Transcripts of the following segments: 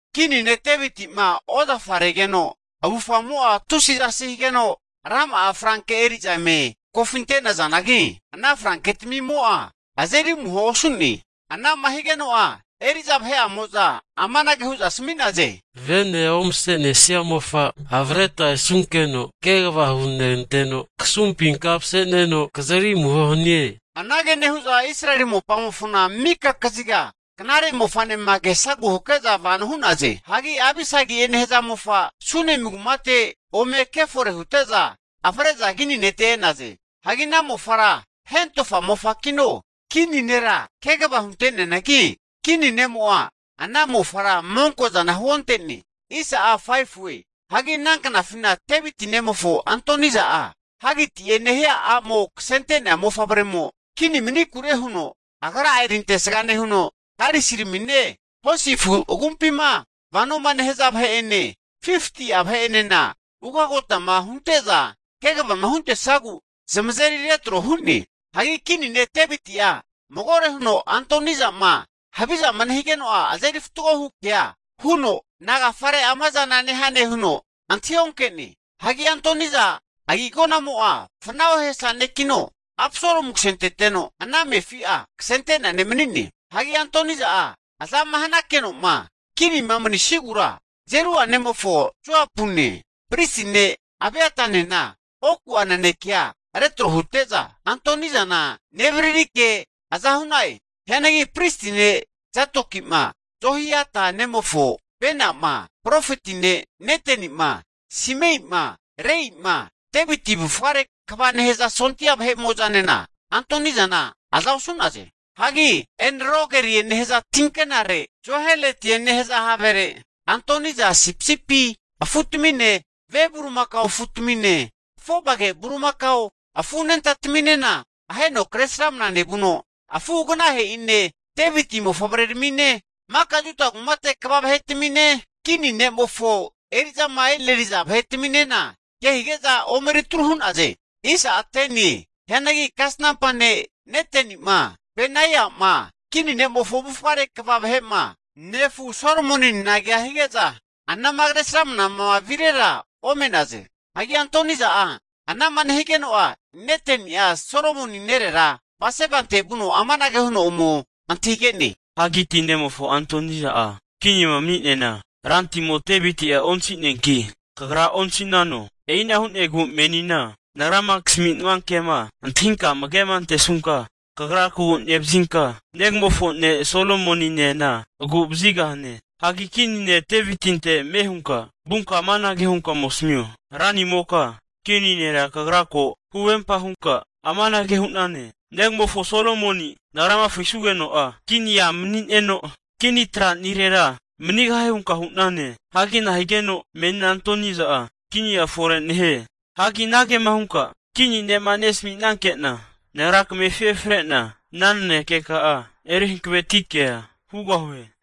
Kini ne' Deviti'ma ozafa regeno avufamo'a tusi zasi higeno, rama'a franke eri'za eme kofinte'nazanagi, ana franketamimo'a azeri amuhoa osu'ne. Ana'ma higeno'a eri'za vahe'amo'za amanage hu'za asami'naze, Vene omase'nesia mofa avreta esunkeno kegava huneganteno, kasumpina mase'neno kazeri amuho hanie. Anage nehu'za Israeli mopamofona mika kaziga knare mofa'nema kesagu hake'za vano hu'naze. Hagi Abisagi'e nehaza mofa Sunemi kumate ome kefore hute'za, avre'za kini nete e'naze. Hagi ana mofara hentofa mofakino, kini nera kegava hunte'neanagi, kini ne'mo'a ana mofara monko'zana huonte'ne. Hagi ana knafina Deviti nemofo Adoniza'a Hagiti'e nehia a'mo kasente'nea mofavremo kini mani'nakure huno agra'a erintesga nehuno, karisiramine hosi afu agumpima vanoma nehaza vahe'ene, 50'a vahe'enena ugotama hunte'za kvama huntesagu zamazeri retro hu'ne. Hagi Kini ne' Deviti'a magore huno Adoniza'ma havizama nehigeno'a azeri fatgohu kea huno, Nagafare ama zana nehane huno antahi onke'ne. Hagi Adoniza agi'agonamo'a fana ohesa nekino, Absalomu kasenteteno, ana amefi'a kasente'nea ne' mani'ne. Hagi Adoniza'a azama hanakeno'ma kinima mani'sigura, Zerua nemofo Joapune, pristi ne' Abiatanena oku'a nanekea retro hute'za Adonizana nevaririke aza hu'na'e. Hianagi pristi ne' Zadoki'ma, Jehoiada nemofo Benai'ma, profeti ne' Neteni'ma, Simeima, Reima, Deviti avufgare kva nehaza sondia vahe'mo'zanena Adonizana aza osu'naze. Hagi En-Rogeli nehaza tinkenare Zoheletie nehaza havere Adoniza'a sipisipi afu'tamine, ve bulimakao afutamine, afovage bulimakao afu anentataminena aheno kre sramana nevuno, afu'aganahe'ine, Deviti mofavreramine, maka Juda kumate kva vahetamine, kini ne'mofo eri'zama e'neriza vahetaminena kehige'za omeritru hu'naze. Hianagi kasnampa ne' Neteni'ma Benaiama, kini ne'mofo avufgare kva vahe'ma, nefu Solomoninena kea hige'za anama Kresramanama virera ome'naze. Hagi Adoniza'a ana'ma nehigeno'a, Neteni'a Solomoni nerera Batsebante vuno amanage huno ome antahige'ne? Hagiti nemofo Adoniza'a kinima mani'neana, rantimo Deviti'a antahigeno, kagranena antahinano? E'ina hu'negu menina nagrama kasaminua ke'ma antahinka amagema antesunka, kagra kagu nevazinka negamofo ne' Solomoninena agu'vazigahane. Hagi Kini ne' Devitinte ame hunka vunka amanage hunka ome asamio, ranimoka kini nera kagra ko huvempa hunka amanage hu'nane, negamofo Solomoni nagrama frisugeno'a kinia manineno kini tranirera manigahie hunka hu'nane. Hagi nahigeno menina Adoniza'a kinia fore nehie? Hagi anagema hunka kini ne'ma nesaminanke'na, nagra kamefi efre'na, ana nanekeka'a eri hankaveti kea hugahue.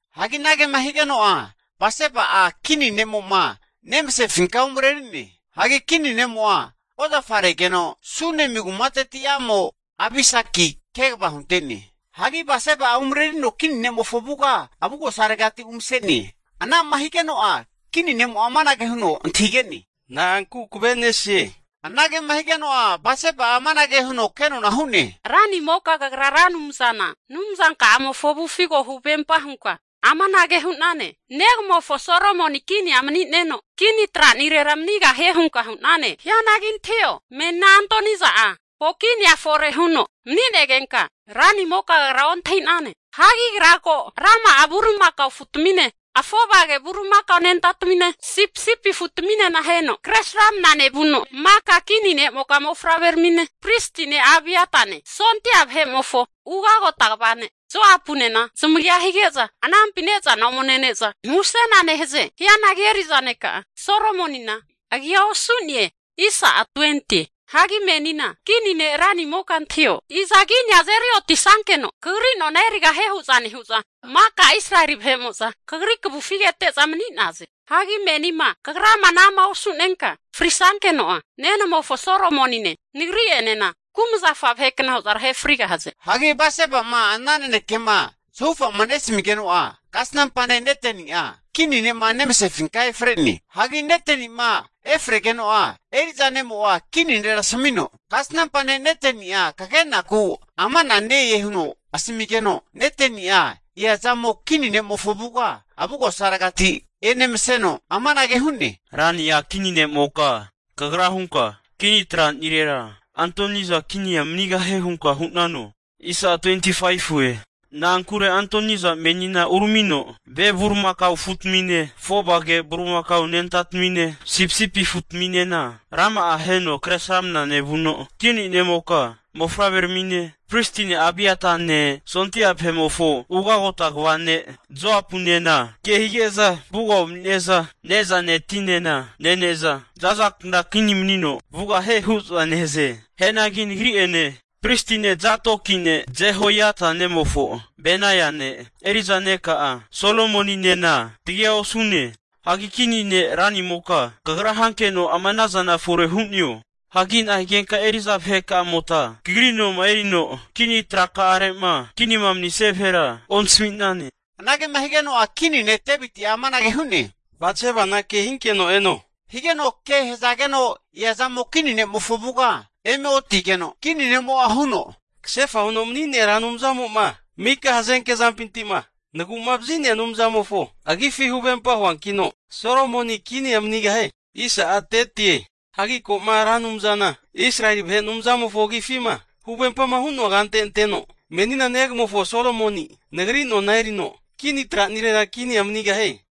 Hagi anagema higeno'a Batseba'a kini ne'mo'ma nemasefinka umareri'ne. (Hagi kini ne'mo'a ozafaregeno Sunemu kumateti a'mo Abisaki kegava hunte'ne.) Hagi Batseba'a umarerino kini ne'mofo avuga avugosaregati umase'ne. Anama higeno'a kini ne'mo'a amanage huno antahigene, Na'anku kavenesie? Anagema higeno'a Batseba'a amanage huno kenona hu'ne, ranimoka kagra Ra Anumzana Anumzanka'amofo avufi ko huvempa hunka amanage hu'nane, Negamofo Solomoni kinia mani'neno, kini tra'nirera manigahie hunka hu'nane. Hianagi antahio, menina Adoniza'a ko' kinia fore huno mani'negenka, ranimoka kagra ontahinane. Hagi agra ko rama'a bulimakao afutamine, afovage bulimakao anentatamine, sipisipi afutaminena aheno kre sramana nevuno, maka kini ne'moka mofavreramine, pristi ne' Abiatane, sondia vahe'mofo ugagota kva ne' Joapunena zamagia hige'za anampina ne'zana ome nene'za musena nehaze. Hianagi eri'za neka'a Solomonina agia osu'ne. Hagi menina kini ne' ranimoka antahio, iza kinia azeri otisankeno kagri nona erigahie hu'za nehu'za, maka Israeli vahe'mo'za kagri kavufi kete'za mani'naze. Hagi menima kagrama ana'ma osu'nenka frisankeno'a nenamofo Solomonine nagri'enena kumazafa vahekna hu'za tahe frigahaze. Hagi Batseba'ma ana nanekema zahufama nesamigeno'a kasnampa ne' Neteni'a kini ne'ma nemasefinka efre'ne. Hagi Neteni'ma efregeno'a eri'za ne'mo'a kini nera asamino, Kasnampa ne' Neteni'a kagenaku ama'na ne-e huno asamigeno, Neteni'a eazamo kini ne'mofo avuga avugosaregati enemaseno, amanage hu'ne, Rania kini ne'moka, kagra hunka kini tranirera Adoniza kinia manigahie hunka hu'nano? Na'ankure Adoniza menina uramino ve bulimakao afutamine, afovage bulimakao anentatamine, sipisipi afutaminena rama'a aheno kresramana nevuno, kini ne'moka mofavreramine pristi ne' Abiatane, sondia vahe'mofo ugagota kva ne' Joapunena kehige'za avuga umanine'za ne'zane tinena nene'za zazakna kini manino vugahie hu'za nehaze. Hianagi nagri'ene, pristi ne' Zadokine, Jehoiada nemofo Benaiane, eri'za neka'a Solomoninena tagia osu'ne. Hagi kini ne' ranimoka kagra hankeno ama'na zana fore hu'neo? Hagi nahigenka eri'za vaheka'amota kagri noma erino kini traka'are'ma kinima manisia vahera ontasami'nane. Anagema higeno'a kini ne, Deviti'a amanage hu'ne, Batsebana kehinkeno eno, higeno ke hazageno eazamo kini ne'mofo avuga eme otigeno, kini ne'mo'a huno, Kasefa huno mani'nea Ra Anumzamo'ma mika hazenke zampinti'ma nagu'ma vazi'nea Anumzamofo agifi huvempa huankino, Solomoni kinia manigahie. Hagi ko'ma Ra Anumzana Israeli vahe Anumzamofo agifima huvempama hu'noa kante anteno, menina negamofo Solomoni nagri nona erino kini tranirera kinia manigahie.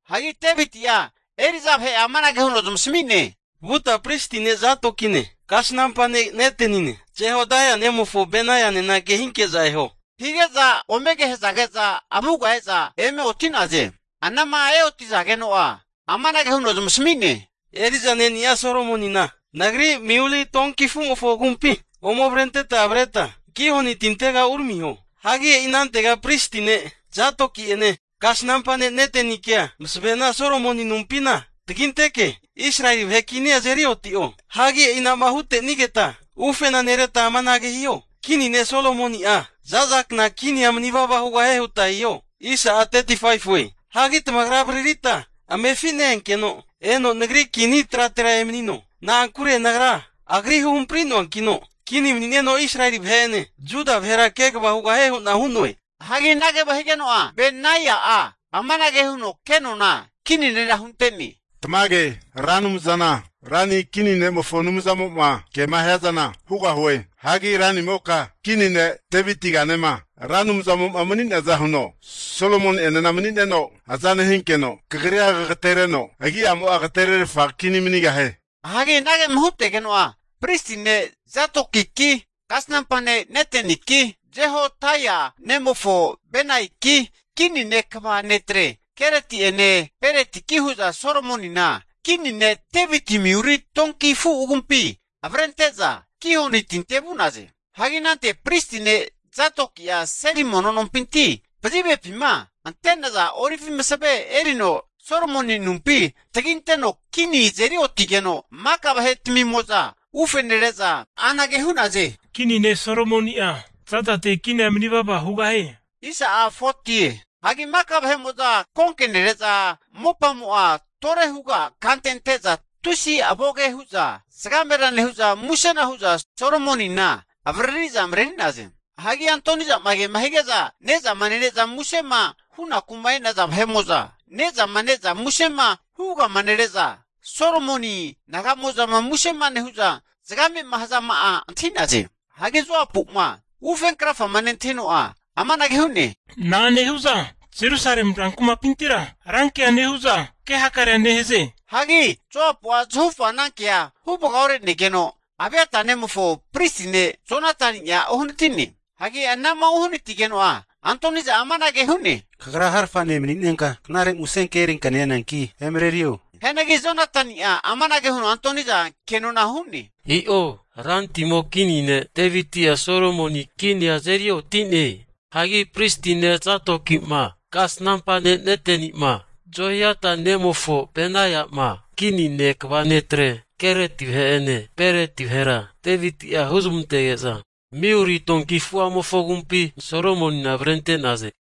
Hagi Deviti'a eri'za vahe'a amanage huno zamasami'ne, Vuta pristi ne' Zadokine, kasnampa ne' Netenine, Jehodaia nemofo Benaianena kehinke'za eho, hige'za ome ke hazage'za avuga e'za eme oti'naze. Anama eoti'zageno'a amanage huno zamasami'ne, Eri'za ne'ni'a Solomonina nagri miulie donki afu' agumpi ome avrenteta avreta Gihoni tintega uramiho. Hagi e'i anantega pristi ne' Zadoki'ene, kasnampa ne' Netenikea masavena Solomoni anumpina taginteke, Israeli vahe kinia azeri oti'o. Hagi e'ina'ma hute'nigeta ufena nereta amanage hiho. Kini ne' Solomoni'a zaza kna kinia manivava hugahie huta hiho. Hagi tamagra avaririta amefi ne-enkeno eno nagri kini tratera emanino. Na'ankure nagra agri huhampri'noankino kini mani'neno Israeli vahe'ene Juda vahera kegava hugahie hu'na hu'noe. Hagi anagema higeno'a Benaia'a amanage huno kenona kini nera hunte'ne, Tamage! Ra Anumzana rani kini ne'mofo Anumzamo'a ke'ma hiazana hugahie. Hagi ranimoka kini ne' Devitiganema Ra Anumzamo'ma mani'neaza huno Solomoni'enena mani'neno aza nehinkeno, kagrira kagatereno agi'amo'a agatererfa kini ne' manigahie. Hagi anagema hutegeno'a pristi ne' Zadokiki, kasnampa ne' Neteniki, Jehodaia nemofo Benaiaki, kini ne' kva netre Kereti'ene Peretiki hu'za Solomonina Kini ne' Deviti miuli donki afu agumpi avrente'za Gihoni tinte vu'naze. Hagi anante pristi ne' Zadoki'a seli mono nompinti pazivepima ante'naza olivi masave erino Solomoni anumpi taginteno kini azeri otige'za, maka vahetmimo'za ufe nere'za anage hu'naze, kini ne' Solomoni'a zazate kinia mani vava hugahie! Hagi maka vahe'mo'za konke nere'za mopamo'a tore huga kante ante'za tusi avoge hu'za zagamera nehu'za, musena hu'za Solomonina avaririza mareri'naze. Hagi Adonizama kema hige'za ne'zama nene'za musema hunaku'ma enaza, vahe'mo'za ne'zama ne'za musema huvagama nere'za Solomoni naga'mo'zama musema nehu'zama hazama'a antahi'naze. Hagi Joapu'ma ufenkrafama nentahino'a, amanage hu'ne, na'a nehu'za Jerusalemi rankumapintira rankea nehu'za ke hakarea nehaze? huno zamantahige'ne. Hagi Joapu'a zahufa anankea huvaga ore'negeno, Abiata nemofo pristi ne' Jonatani'a uhanati'ne. Hagi anama uhanatigeno'a Adoniza'a amanage hu'ne, Kagra so'e ne' mani'nenka knare musenke erinka neananki emarerio. Hianagi Jonatani'a amanage huno Adoniza kenona hu'ne, I'o, rantimo kini ne' Deviti'a Solomoni kinia azeri oti'ne! Hagi pristi ne' Zadoki'ma, kasnampa ne' Neteni'ma, Jehoiada nemofo Benaia'ma kini nete kva netrene Kereti vahe'ene Pereti vahera Deviti'a huzmantege'za miuli donki afu'amofo agumpi Solomonina avrente'naze.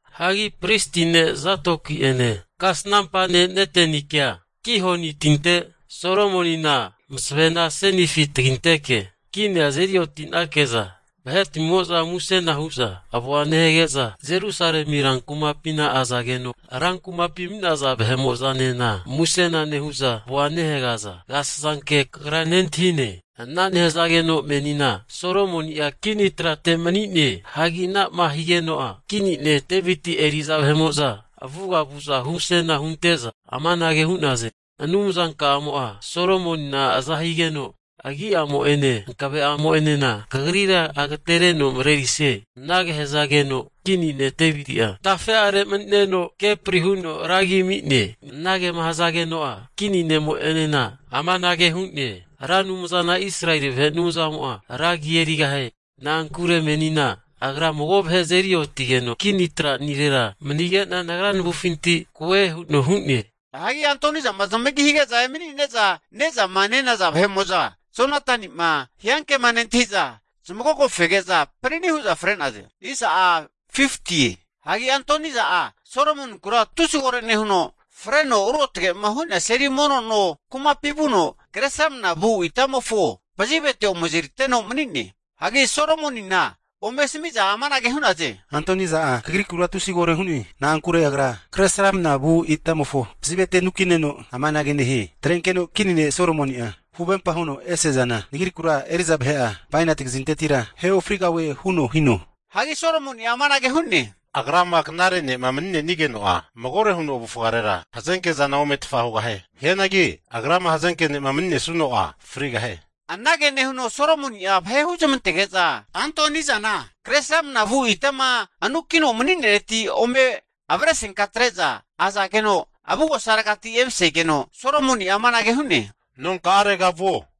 Hagi pristi ne' Zadoki'ene, kasanampa ne' Netenikea Gihoni tinte Solomonina masavena asenifi taginteke kinia azeri oti'nake'za vahetmimo'za musena hu'za avoa nehage'za Jerusalemi rankumapina azageno, rankumapima mani'naza vahe'mo'zanena musena nehu'za avoa nehagaza agasasanke kagra nentahine. Ana nehazageno menina Solomoni'a kini trate mani'ne. Hagi ana'ma higeno'a kini ne' Deviti eri'za vahe'mo'za avuga vu'za humusena hunte'za amanage hu'naze, Anumzanka'amo'a Solomonina azahanigeno agi'amo'ene hankave'amo'enena kagrira agatereno marerisie. Anage hazageno kini ne' Deviti'a tafe'are mani'neno kepri huno Anumzamofona ra agi ami'ne. Anagema hazageno'a kini ne'mo'enena amanage hu'ne, Ra Anumzana Israeli vahe Anumzamo'a ragi erigahie. Na'ankure menina Agra mago vahe azeri otigeno kini tranirera manige'na nagra navufinti koe huno hu'ne. Hagi Adonizama zamagi hige'za emani'neza ne'zama nenaza vahe'mo'za Jonatani'ma hiankema nentahi'za, zamagogofege'za panani hu'za fre'naze. Hagi Adoniza'a Solomoninkura tusi kore nehuno, freno ruotge'ma hu'nea seli mono no kumapi vuno kre sramnamavu itamofo pazivete ome azeriteno mani'ne. Hagi Solomonina ome asamiza amanage hu'naze, Adoniza'a kagrikura tusi koro hu'ne. Na'ankure agra kre sramnavu itamofo pazivete anukineno amanage nehie, Atrenkeno kini ne' Solomoni'a huvempa huno ese'zana nagrikura eri'za vahe'amo'na bainati kazintetira ahe ofrigahue huno hino. Hagi Solomoni'a amanage hu'ne, agrama knare ne'ma mani'nenigeno'a, magore huno avufgarera hazenkezana ometfa hugahie. Hianagi agrama hazenke ne'ma maninesuno'a frigahie. Anage nehuno Solomoni'a vahe huzamantege'za Adonizana kre sramnamavu itama anukino mani'neretira ome avrefenka atre'za azageno, avugosaregati emasegeno, Solomoni'a amanage hu'ne, nonka'arega vuo.